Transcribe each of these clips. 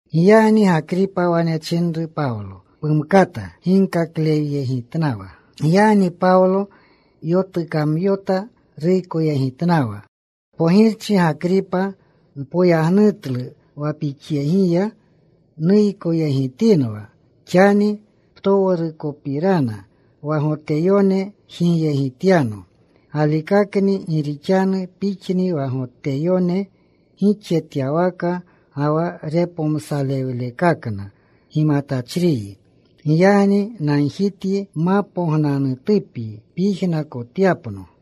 Giyagni Gakripa wane chinru Pawlo, “Pumkata ginkakleyegitnawa.” Giyagni Pawlo yotukamyota. Ruykoyegitnawa, “Pogirchi Gakripa, npoyagnutlu wa pixyegiya nuykoyegitinwa xani ptowrukopirana wa Goteyone jigyegityano. Galikakakni. Gi rixanu pixni wa Goteyone gixjetyawaka ga wa repomsalewlekakna gimatachriyi. Giyagni nagjityi mapognanutupyi pyijnakotyapno.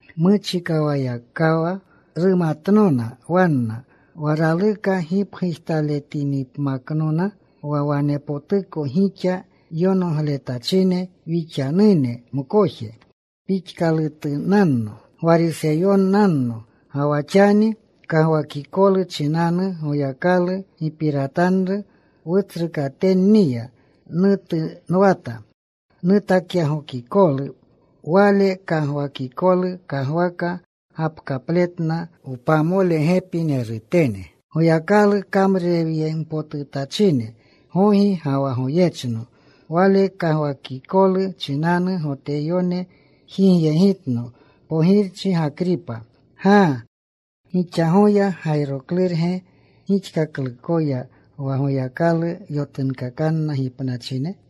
Muchikawayakawa rumatnona wanna, wa raluka gipgujtaletinipmaknona, wa wanepotuko gixa yonogletachine wixanune mkoje pixkalutunanno Gwariseyonanno. Ga wa xani kagwakikolu chinanu Goyakalu gipiratanru wutsrukatenniya nutunwata nutakyagokikolu. Wale kagwakikolu kagwaka gapkapletna wpamolegepinerutene, Goyakalu kamrurewyempotutachine gogi ga wa goyechno. Wale kagwakikolu chinanu Goteyone jigyegitno, Pogirchi Gakripa. ¡Gaa! ¿Gixa goya gayroklurge gixkaklukoya wa Goyakalu yotunkakanna gipnachine?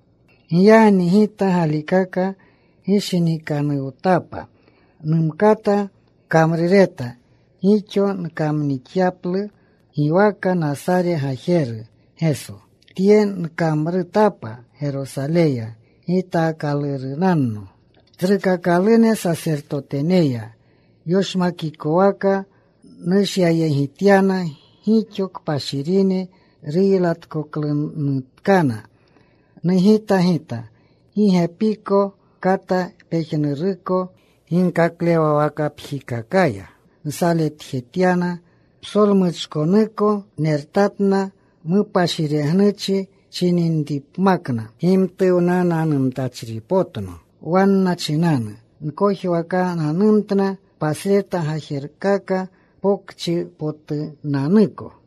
“Giyagni gita galikaka gishinikanuwtapa numkata kamrureta gixo nkamnixyaplu giwaka Nasare Gajeru Geso. Tye nkamrutapa Gerosaleya. Gitaakalurunanno tsrukakalune sasertoteneya. Yoshmakikwaka nushyayegityana gixo kpashirine. Ruylatkoklunutkana, nugita gita. Gi gepiko kata pejnuruko ginkaklewawakapjikakaya nsaletjetyana. Psolmuchkonuko nertatna mupashiregnuchi chininripmakna. Gimtuwnananumtachripotno wanna chinanu. Nkojwakananumtna pasreta gajerkaka pokchipotunanuko.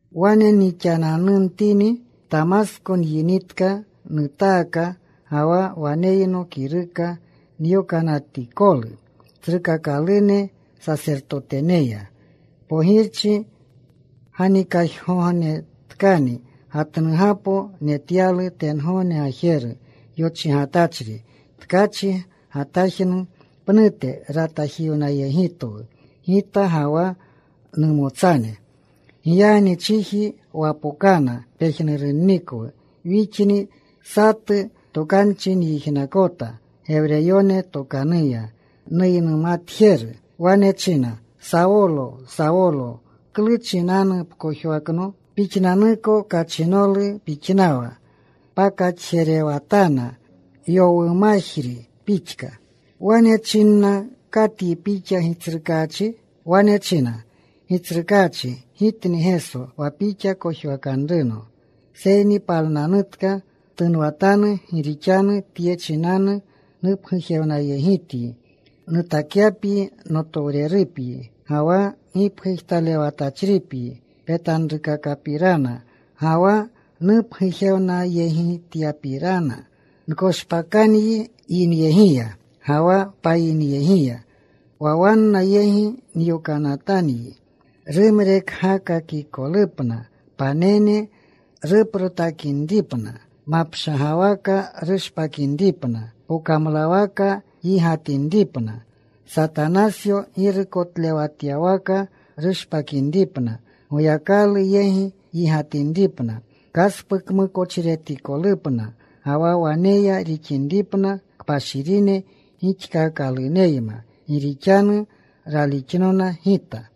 “Wane nixananumtini, Tamasko nyinitka. Nutaaka ga wa waneyno kiruka nyokanatikolu tsrukakalune sasertoteneya. Pogirchi, ganikajgognetkani gatnugapo netyalu tengogne gajeru yochigatachri, tkachi gatajnu pnute. Ratajiwnayegitwu gita ga wa numotsane. Giyagni chiji wapokana pejnurunnikwu wixni. Satu tokanchi nyijnakota Gewreyone tokanuya nuynumatjeru. Wane china, ‘Sawolo, Sawolo, ¿klu chinanu pkojwakno? Pixnanniko kachinolu pixnanwa pakaxjerewatana yowumajri pixka.’ “Wane nchina, ‘¿Katyi Pixa, Gitsrukaachi?’ “Wane china Gitsrukaachi, ‘Gitni Geso wa pixa kojwakanruno. Seyni palnanutka. Ptunwatanu. Gi rixanu tye chinanu nupgujewnayegityi nutakyapyi notowrerupyi ga wa gipgujtalewatachripyi petanrukakapirana ga wa nupgujewnayegityapyipirana. Nkoshpakanyi yinyegiya ga wa payinyegiya, wa wanna yegi nyokanatanyi. Rumrekgakakikolupna panene, ruprotakinripna, mapshagwaka rushpakinripna. Pokamlawaka yigatinripna; Satanasyo girukotlewatyawaka rushpakinripna; Goyakalu yegi yigatinripna; kaspukmukochiretikolupna, ga wa waneya rixinripna kpashirine gixkakaluneyma, gi rixanu ralixnona Gita.’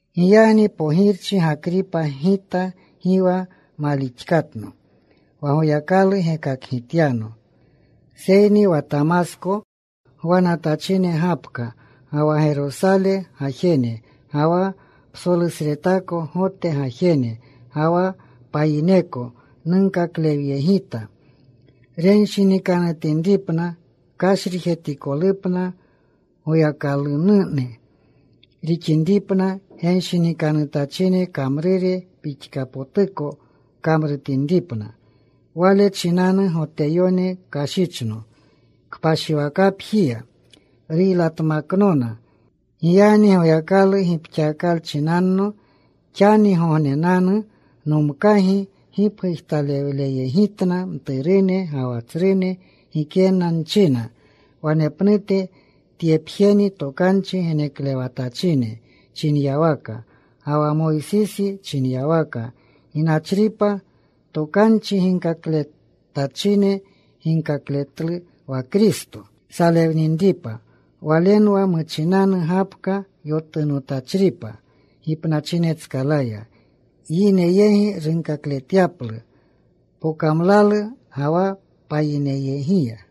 “Giyagni, pogirchi Gakripa, gita gi wa malixkatno wa Goyakalu gekakgityano. Seyni wa Tamasko gwanatachine gapka, ga wa Gerosale gajene, ga wa psolusretako Gote gajene, ga wa payineko nunkaklewyegita renshinikanutinripna. Kashrijetikolupna Goyakalunune rixinripna, genshinikanutachine kamrure pixkapotuko kamrutinripna. Wale chinanu Goteyone kashichno kpashiwakapjiya. Ruylatmaknona. Giyagni Goyakalu gipxakalchinanno, xanigognenanu nomkagi gipgujtalewleyegitna mturune ga wa tsrune. Gikena nchina wanepnute. Tyepjeni tokanchi geneklewatachine chinyawaka ga wa Moysisi chinyawaka ginachripa. Tokanchi ginkakletachine ginkakletlu wa Kristo salewninripa. Walenwa muchinanu gapka yotunotachripa gipnachinetskalaya, yine yegi runkakletyaplu pokamlalu ga wa payinyegiya.”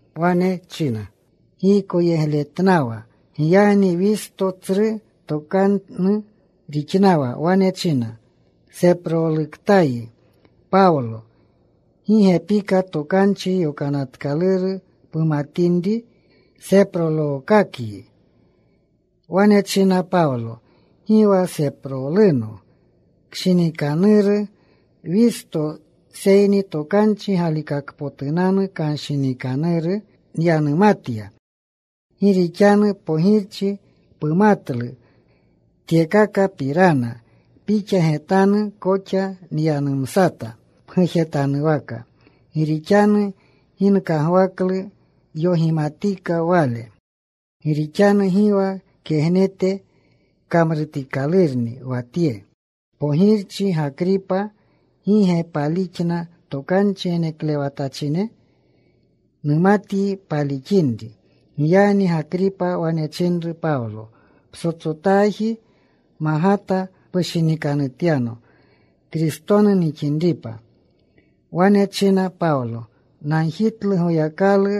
Wane china giykoyegletnawa. Giyagni Wisto tsru tokanu rixnawa. Wane china, “Seproluktayi, Pawlo. Gi gepika Tokanchi Yonatkaluru pumatinri seprolookakyi.” Wane china Pawlo, “Gi wa seproluno, kshinikanuru Wisto, seyni tokanchi galikakpotunanu kanshinikanuru nyanumatya. Gi rixanu, Pogirchi, pumatlu tyekakapirana. Pixa getanu koxa nyanumsata pgujetanwaka. Gi rixanu gi nkagwaklu yogimatika wale. Gi rixanu gi wa kegnete kamrutikalurni wa tye. Pogirchi Gakripa, ¿gi ge palixna tokanchi geneklewatachine? Numatyi palixinri.” Giyagni Gakripa wane chinru Pawlo, “Ptsotsotaji magata pushinikanutyano Kristonu nixinripa.” Wane china Pawlo, “Nagjitlu Goyakalu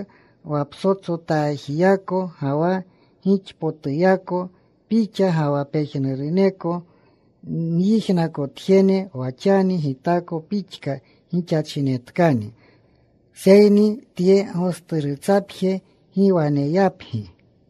wa ptsotsotajiyako ga wa gixpotuyako pixa ga wa pejnuruneko nyijnakotjene wa xani, gitako pixka gixachinetkani, seyni tye gosturutsapje gi waneyapgi.”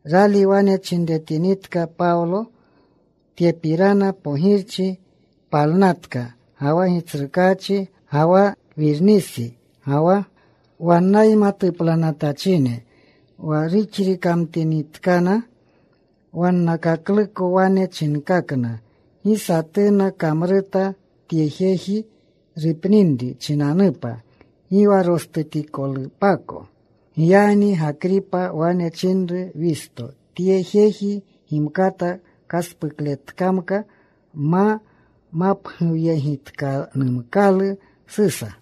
Rali wane chinretinitka Pawlo tyepirana, Pogirchi palnatka, ga wa gitsrukaachi, ga wa Wirnisa, ga wa wannayma tuplanatachine. Wa ruxrikamtinitkana, wannakakluko wane chinkakna, “Gi satuna kamruta tye jeji rupninri chinanupa, gi wa rostutikolupako.” Giyagni Gakripa wane chinru Wisto, “Tye jeji gimkata kaspukletkamka ma mapguwyegitkanumkalu Susa.”